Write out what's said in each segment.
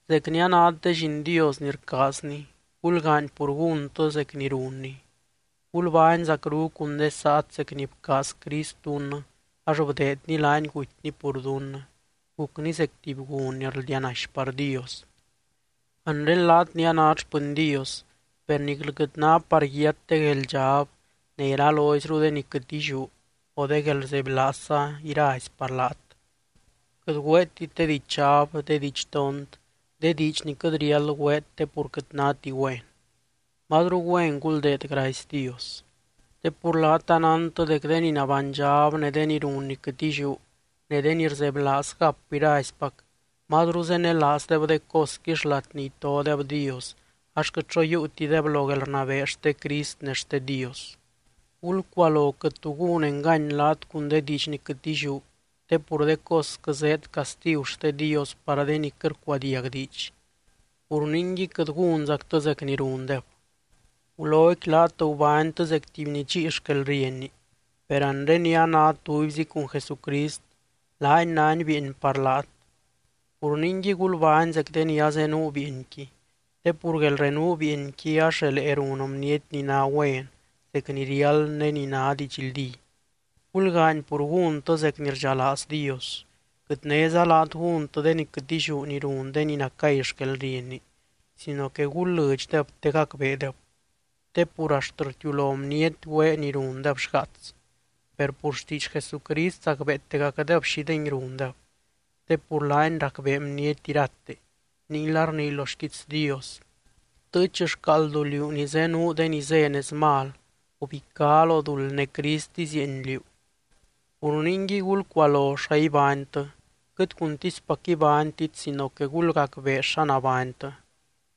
Zec ni anát de lliin Dios ni rcaazny, gulgaany pur gúntɨ zec ni runny. Gulbány zacru cun de saat zec ni bcaaz Crist dunnɨ ax bdeedny laany gutyny pur dunnɨ, gucny zec tuby gun ni rldianaxy par Dios. Anre laat ni anát xpɨny Dios, per niclɨ quɨt ná par yiat de gueldxab ne iraloizru de ni quɨt illiú o de guelrzebylaazza irazy par laat. Quɨt güeetit de dichab, de didxtont, de diidx ni quɨt riáld güeet te pur quɨt náti güen. Mazru güen guldeed gracy Dios. Te pur laat anántɨ dec de ni nabánydxab ne de ni run ni quɨt illiú, ne de ni rzebylaaz gap iraizpac, mazru zenelaazdeb de cosqui xlat ni itodeb Dios ax quɨt xo yiiutideb lo guelrnabee xte Crist ne xte Dios. Gulcualo quɨt tu gún engany laat cun de diidx ni quɨt illiú te pur de cosquɨ zéed castigu xte Dios par de ni quɨt rcuadiag diidx. Pur ningui, quɨt gúnzactɨ zec ni rundeb. Guloqui laat gubánytɨ zec tuby ni dxíi xquelrienni, per anre ni anát tubyzi cun Jesucrist, laany nány bieeny par laat. Pur ningui gulbány zec de ni azenuu bieenqui, te pur guelrenuu bieenqui ax relee run bniety ni ná güen, zec ni riáld ne ni ná didxldí. Gulgaany pur gúntɨ zec ni rdxalaaz Dios. Quɨt néza laat gúntɨ de ni quɨt illiú ni run de ni nacay xquelrienni, sino que gul lɨdxdeb te gacbeedeb. Te pur axt rtiulo bniety güee ni rundeb xgaats. Per pur xtiidx Jesucrist zacbeetegacdeb xídengui rundeb. Te pur laany racbee bniety irate, ninguila rnii lo xquiits Dios: Btɨɨch xcaaldu, liú ni zenuu de ni zé nez mal. Gubicá lo duld ne Crist izieeny liú. Pur ningui, gulcualo xa ibánytɨ, quɨt cuntispac ibánytit sino que gulgacbee xa nabánytɨ.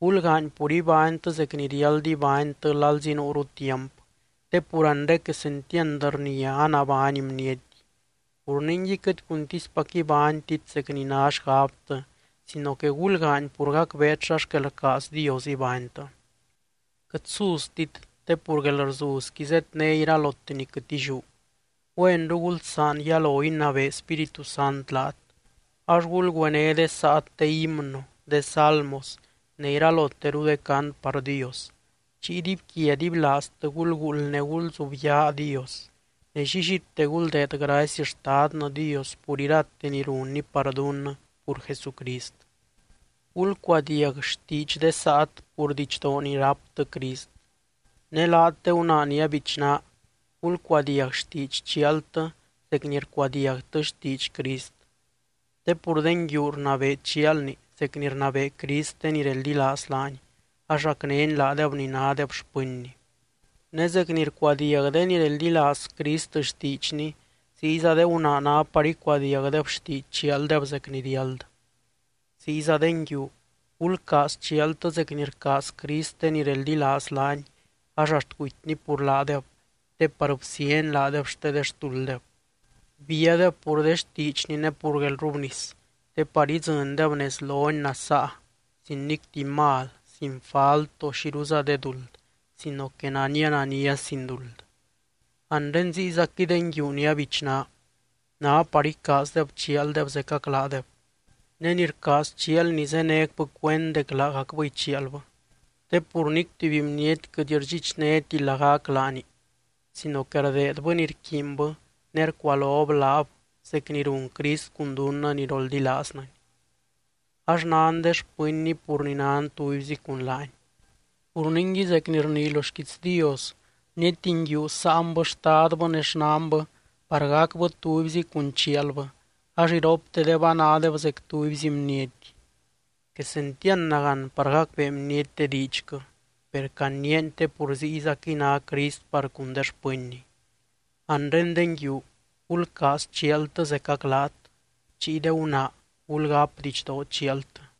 Gulgaany pur ibánytɨ zec ni riáld ibánytɨ lalzi nuuru tiamp, te pur anre quesentiand rnia anabány bniety. Pur ningui, quɨt cuntispac ibánytit zec ni ná xgabtɨ sino que gulgaany pur gacbeet xa xquel rcaaz Dios ibánytɨ. Quɨt suztit, te pur guelrzuzqui zedné iralote ni quɨt illiú. Güenru gulsaan yalo inabee Spíritu Sant laat. Ax gulgüené de saat de himno, de salmos ne iraloteru de cant par Dios. Chiy dibyquia dibylaaztɨ gulguuld ne gulzubyaa Dios. Ne llillite guldeed gracy Xtadnɨ Dios pur irate ni runny par dunnɨ pur Jesucrist. Gulcuadiag xtiidx de saat, pur didxdoo ni ráptɨ Crist. Ne laat de gunaa ni abichná, gulcuadiag xtiidx chialtɨ zec ni rcuadiagtɨ xtiidx Crist. Te pur de nguiu rnabee chialni zec ni rnabee Crist de ni reldilaaz laany ax racnény laadeb ni nádeb xpɨnny. Ne zec ni rcuadiag de ni reldilaaz Crist xtiidxny ziyza de gunaa ná par icuadiagdeb xtiidx chialdeb zec ni riáld. Ziyza de nguiu, gulcaaz chialtɨ zec ni rcaaz Crist de ni reldilaaz laany ax axt gutyny pur laadeb te par bsíany laadeb xte de xtulddeb. Bíadeb pur de xtiidxny ne pur guelrrubnis te par idzɨndeb nez lony nasaa sin nic tuby mal, sin falt o xiruza de duld, sino que nania, nania sin duld. Anre ziyzaquɨy de nguiu ni abichná, ná par icaazdeb chialdeb zecac laadeb. Ne ni rcaaz chialni zénecbɨ cuend dec laagacbɨy chialbɨ. Te pur nic tuby bniety quɨt rdxichnéti lagac laani sino que rdeedbɨ ni rquiinbɨ ne rcualob laab zec ni run Crist cun dunnɨ ni roldilaaznɨny. Ax nan de xpɨnny pur ni nan tubyzi cun laany. “Pur ningui”, zec ni rnii lo xquiits Dios, “Bniety nguiu sáanbɨ xtadbɨ ne xnanbɨ par gacbɨ tubyzi cun chialbɨ ax iroptedeb anádeb zec tubyzi bniety.” Quesentiand nagán par gacbee bniety de diidxquɨ, per caniiani te pur ziyzaquɨy ná Crist par cun de xpɨnny. Anre de nguiu, gulcaaz chialtɨ zecac laat. Chiy de gunaa, gulgáp didxdoo chialtɨ.